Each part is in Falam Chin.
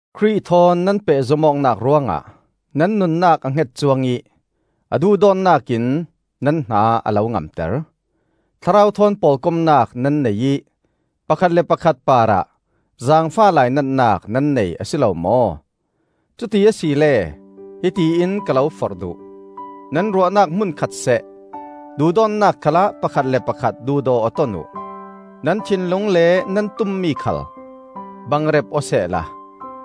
Khrih thawn nan pehzom awknak ruangah nan nunnak a hnget cuang ih a duhdawtnak in nan hna a lo ngamter. Thlarau thawn pawlkomnak nan nei ih pakhat le pakhat parah zaangfah lainatnak nan nei a si lo maw? Cuti asile hiti in ka lo forh duh: nan ruahnak hmunkhat seh, duhdawtnak khalah pakhat le pakhat duhdaw aw ton uh; nan thinlung le nan tummi khal bangrep aw sehla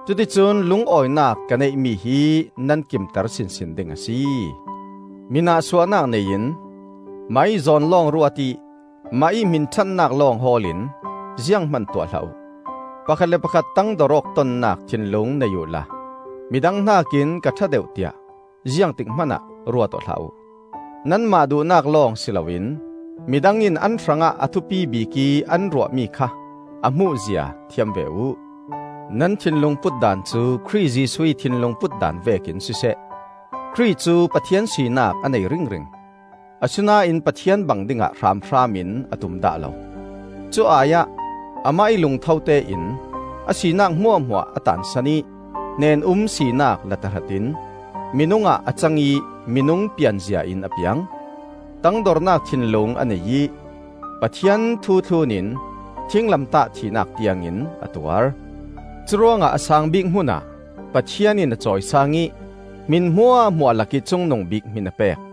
cuticun lungawinak ka neihmi hi nan kimter sinsin ding a si. Mi nahsuahnak nei in, mahih zawn lawng ruat ih, mahih hminṭhatnak lawng hawl in zianghman tuah hlah uh. Pakhat le pakhat tangdor awk tonnak thinlung nei uhla midang hnakin ka ṭha deuh tiah ziangtik hmanah ruat aw hlah uh. Nanmah duhnak lawng si loin midang in an hrangah a thupi bikih an ruahmi kha a hmuhzia thiam ve uh. Nan thinlung putdan cu Khrih Jesuh ih thinlung putdan vekin siseh. Khrih cu Pathian sinak a nei ringring; Asinain Pathian bang dingah hranhram in a tum dah lo. Cu ai-ah, Amah ih lungtho tein, a sinak hmuahhmuah a taansan ih, hnen-um sinak la tahratin, Minung ah a cang ih minung pianzia in a piang. Tangdornak thinlung a nei ih, Pathian thu thlun in, Thinglamtah thihnak tiangin a tuar. Curuangah a saang bik hmunah Pathian in a cawisaang ih, Hmin hmuahhmuah lakih cungnung bik hmin a pek.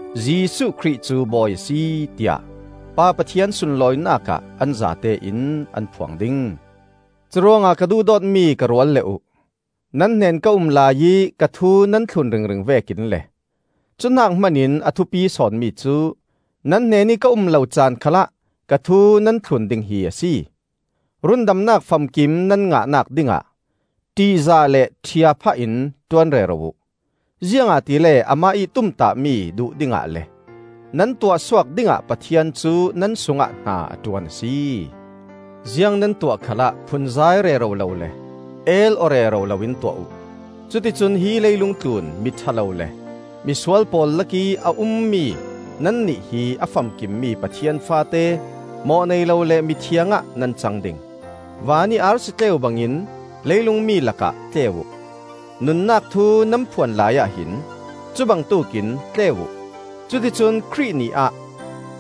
Jesuh Khrih cu Bawi a si, tiah Pa Pathian sunlawinak ah an zate in an phuang ding. Curuangah, ka duhdawtmi ka rualle uh, nan hnen ka um laiih ka thu nan thlun ringring vekin le, cu hnak hmanin a thupi sawn mi cu, nan hnenih ka um lo caan khalah ka thu nan thlun ding hi a si. Rundamnak famkim nan ngahnak dingah ṭihzah le ṭhia phah in ṭuan rero uh. Ziangahtile amah ih tumtahmi duh dingah le nan tuahsuak dingah Pathian cu nan sungah hna a ṭuan a si. Ziang nan tuah khalah phunzai rero lo le el-aw rero loin tuah uh. Cuticun hi leilung tlun miṭha lo le misual pawl lakih a ummi nannih hi a famkim mi Pathian faate, mawh nei lo le mithiang ah nan cang ding. Van ih arsi tleu bangin leilung mi lakah tleu uh. Nunnak thu nan phuan laiah hin cubangtuk in tleu uh. Cuticun Khrih Ni ah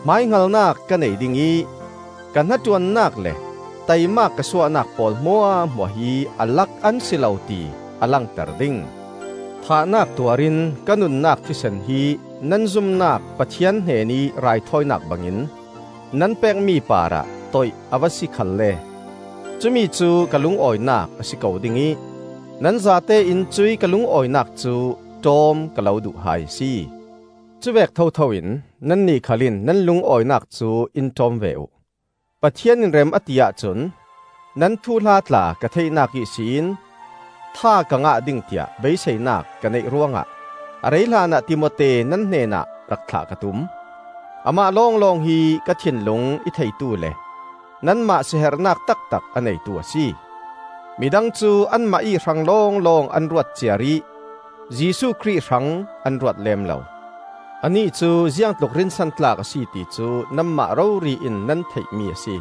hmaihngalnak ka nei dingih ka hnaṭuannak le taimak ka suahnak pawl hmuahhmuah hi a lak an si lo, ti a langter ding. Thahnak tuarin ka nunnak thisen hi nan zumnak Pathian hnenih raithawinak bangin nan pekmi parah toih a va si khalle cumi cu ka lungawinak a si ko ding ih nan zatein cuih ka lungawinak cu ṭawm ka lo duh hai a si. Cuvek thotho in nannih khal in nan lungawinak cu in ṭawm ve uh. Pathian in rem a ti ahcun, nan thuhla tla ka theihnak ihsin tha ka ngah ding tiah beiseinak ka neih ruangah a rei hlanah Timote nan hnenah rak thlah ka tum. Amah lawnglawng hi ka thinlung i theitu le nanmah seherhnak taktak a neitu a si. Midang cu anmah ih hrang lawnglawng an ruat ciar ih Jesuh Khrih hrang an ruat lem lo. Anih cu ziangtluk rinsantlak a si ti cu nanmah rori in nan theihmi a si: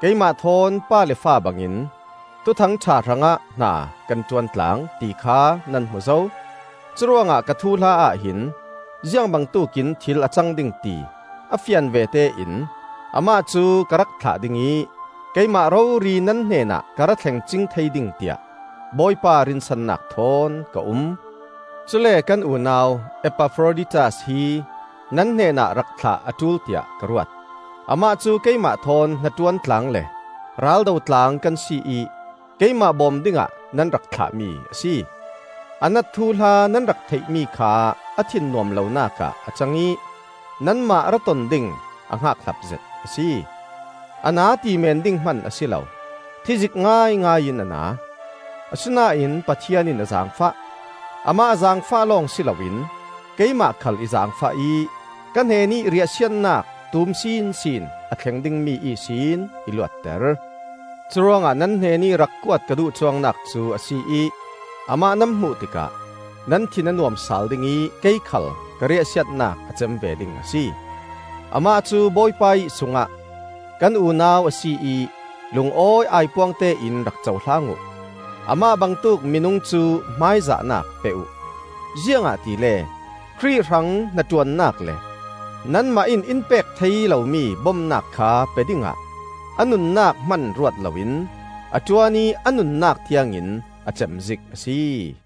keimah thawn pa le fa bangin Thuthang ṭha hrangah hna kan ṭuan tlang, ti kha nan hmu zo. Curuangah ka thuhla ahhin ziangbangtuk in thil a cang ding ti a fian vete in amah cu ka rak thlah ding ih, keimah rori nan hnenah ka ra thleng cing thei ding tiah Bawipa rinsannak thawn ka um. Cule kan unau Epafroditas hi nan hnenah rak thlah a ṭul tiah ka ruat. Amah cu keimah thawn hnaṭuan tlang le raldo tlang kan si ih keimah bawm dingah nan rak thlahmi a si. A nat thuhla nan rak theihmi kha a thin nuam lonak ah a cang ih nanmah ra ton ding a hngakhlap zet a si. A na ti meen ding hman a si lo, thizik ngaingai in a na. Asinain Pathian in a zaangfah; amah a zaangfah lawng si loin keimah khal i zaangfah ih ka hnenih riahsiatnak tum sinsin a thleng dingmi ihsin i luatter. Curuangah nan hnenih rak kuat ka duh cuangnak cu a si ih amah nan hmuh tikah nan thin a nuam sal ding ih kei khal ka riahsiatnak a cem ve ding a si. Amah cu Bawipa ih sungah kan unau a si ih lungawi aipuangte in rak cohlang uh. Amah bangtuk minung cu hmaizahnak pe uh, ziangahtile Khrih hrang hnaṭuannak le nanmah in in pek thei lomi bomnak kha pe dingah a nunnak hman ruat loin a ṭuan ih a nunnak tiangin a cem zik a si.